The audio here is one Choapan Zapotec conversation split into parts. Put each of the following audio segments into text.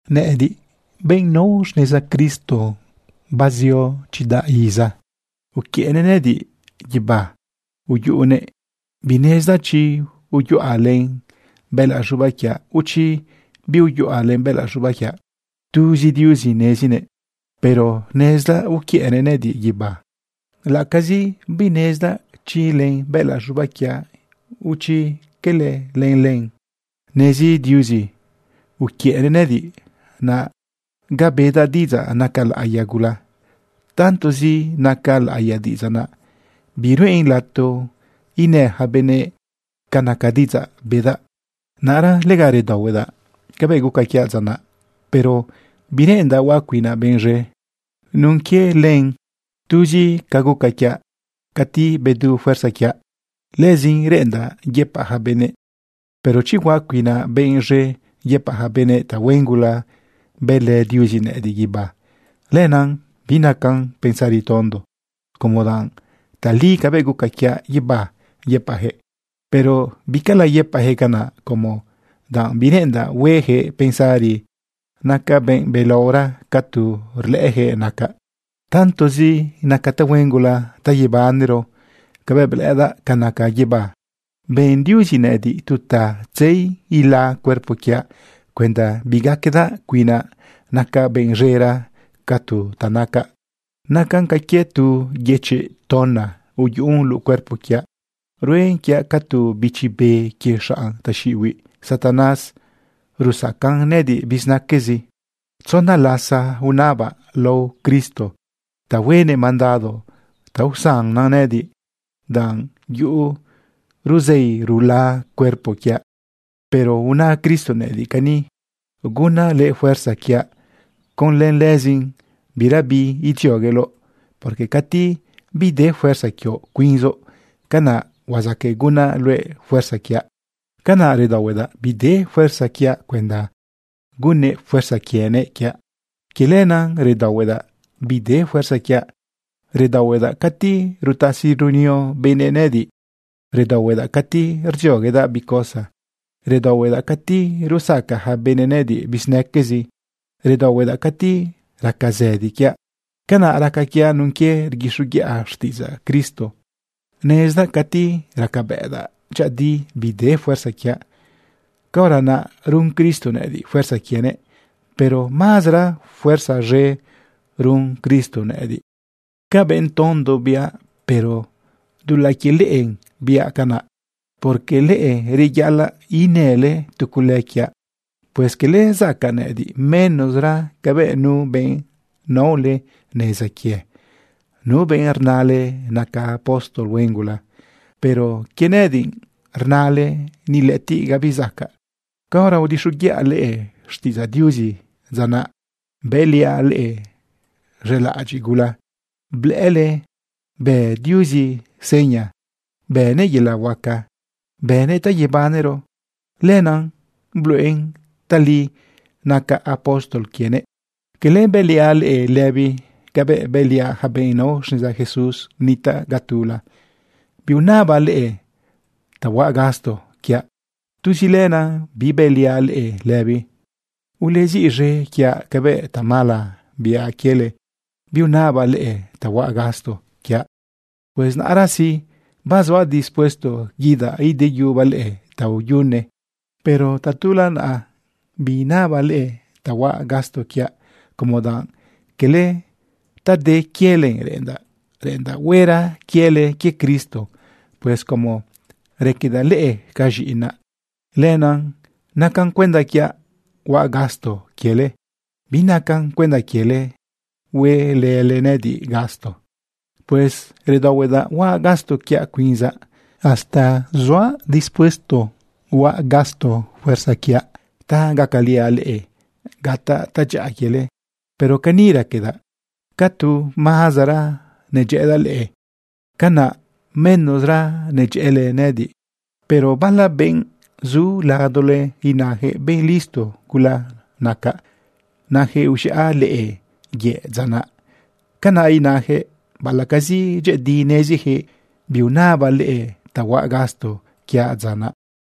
Nëꞌëdiꞌ, benꞌ nao xneza Cristo, azio chidaꞌ iza, uquiëꞌnëꞌ nëꞌëdiꞌ guibá uyune. Binezdaꞌ chi uyaꞌa len bëꞌëlaꞌ z̃ubaꞌ quiaꞌ, o chi biuyaꞌa len bëꞌëlaꞌ z̃ubaꞌ quiaꞌ. Tuzi Diuzi nezinëꞌ. Pero nezdaꞌ uquiëꞌnëꞌ nëꞌëdiꞌ guibá, laꞌacazi binezdaꞌ chi len bëꞌëlaꞌ z̃ubaꞌ o chi cala len. Nezi Diuzi. Uquiëꞌnëꞌ nëꞌëdiꞌ naꞌ ga bedaꞌ diꞌidzaꞌ naca laꞌiya gula. Tantozi naca laꞌiya diꞌidzaꞌ naꞌ, biruꞌen lato inë ja benëꞌ ca naca diꞌidzaꞌ bedaꞌ. Naꞌra lega redaohuedaꞌ cabëꞌ guca quiaꞌ dza naꞌ, pero bireꞌendaꞌ huaꞌ cuinaꞌ benꞌ z̃e nun quie len. Tuz ca guca quiaꞌ cati bedu fuerza quiaꞌ, lëzin reꞌendaꞌ yëpaꞌ ja benëꞌ. Pero chi huaꞌ cuinaꞌ benꞌ z̃e yëpaꞌ ja benëꞌ tahuen gula bëlë Diuzi nëꞌëdiꞌ guibá, lenaꞌ binacan pensari tondo, como danꞌ tali cabëꞌ guca quiaꞌ guibá yëpaꞌjëꞌ. Pero bicala yëpaꞌjëꞌ canaꞌ, como danꞌ bireꞌendaꞌ huejëꞌ pensari nacaꞌ benꞌ belaora ca tu rlëꞌëjëꞌ nacaꞌ. Tantozi naca tahuen gula ta yebanero cabëꞌ blëꞌëdaꞌ ca naca guibá, ben Diuzi nëꞌëdiꞌ tu ta tzei ila cuerpo quiaꞌ cuenda bigaquedaꞌ cuinaꞌ nacaꞌ benꞌ z̃era ca tu ta nacaꞌ. Nacan ca quie tu yëchiꞌ tona uyuꞌun luꞌu cuerpo quiaꞌ. Ruen quiaꞌ ca tu bichi be quie xanꞌ taxiꞌibiꞌ Satanás rusacan nëꞌëdiꞌ bizinaquezi. Tzona lasa unabaꞌ lao Cristo ta huenëꞌ mandado ta usannan nëꞌëdiꞌ danꞌ yuꞌu ruzei rula cuerpo quiaꞌ. Pero una Cristo nëꞌëdiꞌ cani: “Gunaꞌ luëꞌ fuerza quiaꞌ. Conlë lëzin birabi idziogueloꞌ, porque cati bide fuerza quioꞌ cuinzoꞌ, canaꞌ huazaqueꞌ gunaꞌ luëꞌ fuerza quiaꞌ.” Canaꞌ redaohuedaꞌ bide fuerza quiaꞌ cuenda gunnëꞌ fuerza quienëꞌ quiaꞌ. Quie lenaꞌ redaohuedaꞌ bide fuerza quiaꞌ. Redaohuedaꞌ cati rutasi runio benëꞌ nëꞌëdiꞌ. Redaohuedaꞌ cati rdzioguedaꞌ bi cosa. Redaohuedaꞌ cati rusaca ja benëꞌ nëꞌëdiꞌ bizinaquezi. Redaohuedaꞌ cati raca zëdi quiaꞌ. Canaꞌ raca quiaꞌ nun quie rguixoguiꞌa xtiꞌidzaꞌ Cristo. Nezdaꞌ cati racabëꞌdaꞌ dyëꞌëdi bide fuerza quiaꞌ, caora naꞌ run Cristo nëꞌëdiꞌ fuerza quienëꞌ, pero mazara fuerza z̃e run Cristo nëꞌëdiꞌ. Ca benꞌ tondo biaꞌ, pero dulaꞌ quie leꞌe biaꞌ canaꞌ, porque leꞌe reyaꞌalaꞌ inële tu cule quiaꞌ. Pues cala zacaꞌ nëꞌëdiꞌ menosra cabëꞌ nu benꞌ naole neza quie, nu benꞌrnale naca apóstol huen gula. Pero quie nëꞌëdiꞌ rnale ni lëꞌëtiꞌ gabi zacaꞌ. Caora udixoguiꞌa leꞌe xtiꞌidzaꞌ Diuzi dza naꞌ, bëliaꞌ leꞌe z̃elaꞌadyiꞌ gula, blëꞌële bë Diuzi seña, bënëꞌ yelaꞌ huaca, bënëꞌ ta yebanero. Lenaꞌ bluꞌen tali nacaꞌ apóstol quienëꞌ. ¿Cala bëliaꞌ leꞌe lëbi cabëꞌ bëliaꞌ ja benꞌ nao xneza Jesús nitaꞌ ga tula? Biunabaꞌ leꞌe ta huaꞌ gasto quiaꞌ. Tuzi lenaꞌ bibëliaꞌ leꞌe lëbi. ¡Ulesiꞌz̃e quiaꞌ cabëꞌ tamala biaꞌ quiele, biunabaꞌ leꞌe ta huaꞌ gasto quiaꞌ! Pues naꞌra sí, bazuaꞌ dispuesto guidaꞌ ideyubaꞌ leꞌe taoyune. Pero tatula naꞌa biinabaꞌ leꞌe ta huaꞌ gasto quiaꞌ como danꞌ quele ta de quiele reꞌendaꞌ, reꞌendaꞌ huera quiele quie Cristo. Pues como raquedaꞌ leꞌe ca z̃iꞌinaꞌ, lenaꞌ naca cuenda quiaꞌ huaꞌ gasto quiele. Binacan cuenda quiele huelële nëꞌëdiꞌ gasto. Pues redaohuedaꞌ huaꞌ gasto quiaꞌ cuinzaꞌ. Hasta zuaꞌ dispuesto huaꞌ gasto fuerza quiaꞌ ta gacaliaꞌ leꞌe gataꞌ tadyaꞌa quiele. Pero cani raquedaꞌ: Ca tu mazara nedyëꞌëdaꞌ leꞌe, canaꞌ menosra nedyëꞌële nëꞌëdiꞌ. Pero bala benꞌ zu ladole inajëꞌ benꞌ listo gula nacaꞌ, najëꞌ uz̃iꞌa leꞌe yëꞌ dza naꞌ. Canaꞌ inajëꞌ baꞌalaꞌcazi dyëꞌëdi nezijëꞌ biunabaꞌ leꞌe ta huaꞌ gasto quiaꞌ dza naꞌ.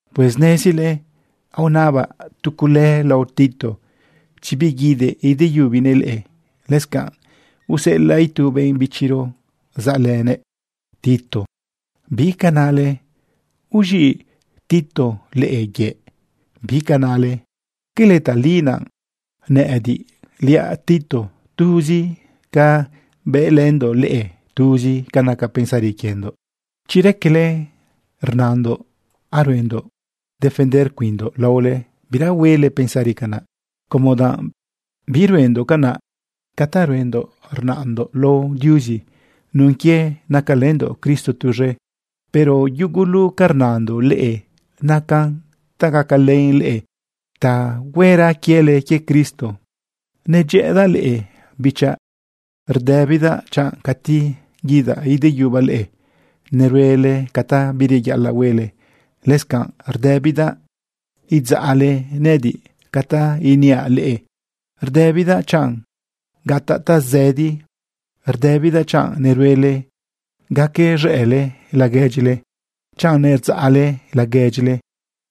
Pues nezile aonabaꞌ tu cule lao Tito chi biguidëꞌ ideyubinëꞌ leꞌe. Lëscanꞌ useꞌelaꞌ itu benꞌ bichiro saꞌlënëꞌ Tito. ¿Bi ca nale? ¿Uz̃iꞌ Tito leꞌe yëꞌ? ¿Bi ca nale? ¿Quele tali naꞌ nëꞌëdiꞌliaꞌ Tito, tuzi ca bëlëndoꞌ leꞌe, tuzi ca naca pensari quiendoꞌ? Chi raquele rnandoꞌ aruendoꞌ defender cuinndoꞌ laole, bira huele pensari canaꞌ, como danꞌ biruendoꞌ canaꞌ. Ca ta ruendoꞌ rnandoꞌ lao Diuzi nun quie nacalëndoꞌ Cristo tuz̃e. Pero yugu ca rnandoꞌ leꞌe nacan ta gacalen leꞌe ta huera quiele quie Cristo. Nedyëꞌëdaꞌ leꞌe bichaꞌ. Rdëbidaꞌ chanꞌ cati guidaꞌ ideyubaꞌ leꞌe neruele ca ta bireyaꞌalaꞌ huele. Lëscanꞌ rdëbidaꞌ idzaꞌle nëꞌëdiꞌ ca ta iniaꞌ leꞌe. Rdëbidaꞌ chanꞌ gataꞌ tazëdi. Rdëbidaꞌ chanꞌ neruele gacaz̃ëꞌle laguedyile, chanꞌ nerdzaꞌle laguedyile,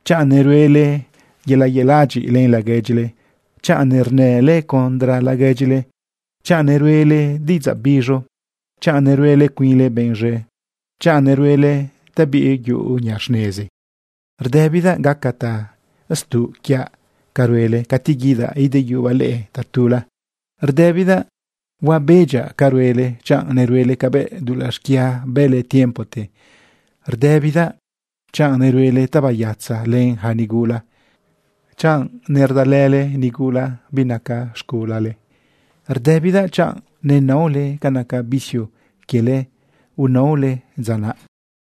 chanꞌ neruele yelaꞌ adyiꞌ len laguedyile, chanꞌ nernële contra laguedyile, chanꞌ neruꞌele diꞌidzaꞌ biz̃u, chanꞌ neruele cuinle benꞌ z̃e, chanꞌ neruele ta biyuꞌu niꞌa xnezi. Rdëbidaꞌ gaca tastuꞌ quiaꞌ ca ruele cati guidaꞌ ideyubaꞌ leꞌe tatula. Rdëbidaꞌ huabedyaꞌ ca ruele chanꞌ neruele cabëꞌ dulaꞌ xquia bële tiempote. Rdëbidaꞌ chanꞌ neruele tabayatza len yaca nigula, chanꞌ nerdalële nigula binaca z̃gulale. Rdëbidaꞌ chanꞌ nenaole ca naca vicio quiele unaole dza naꞌ.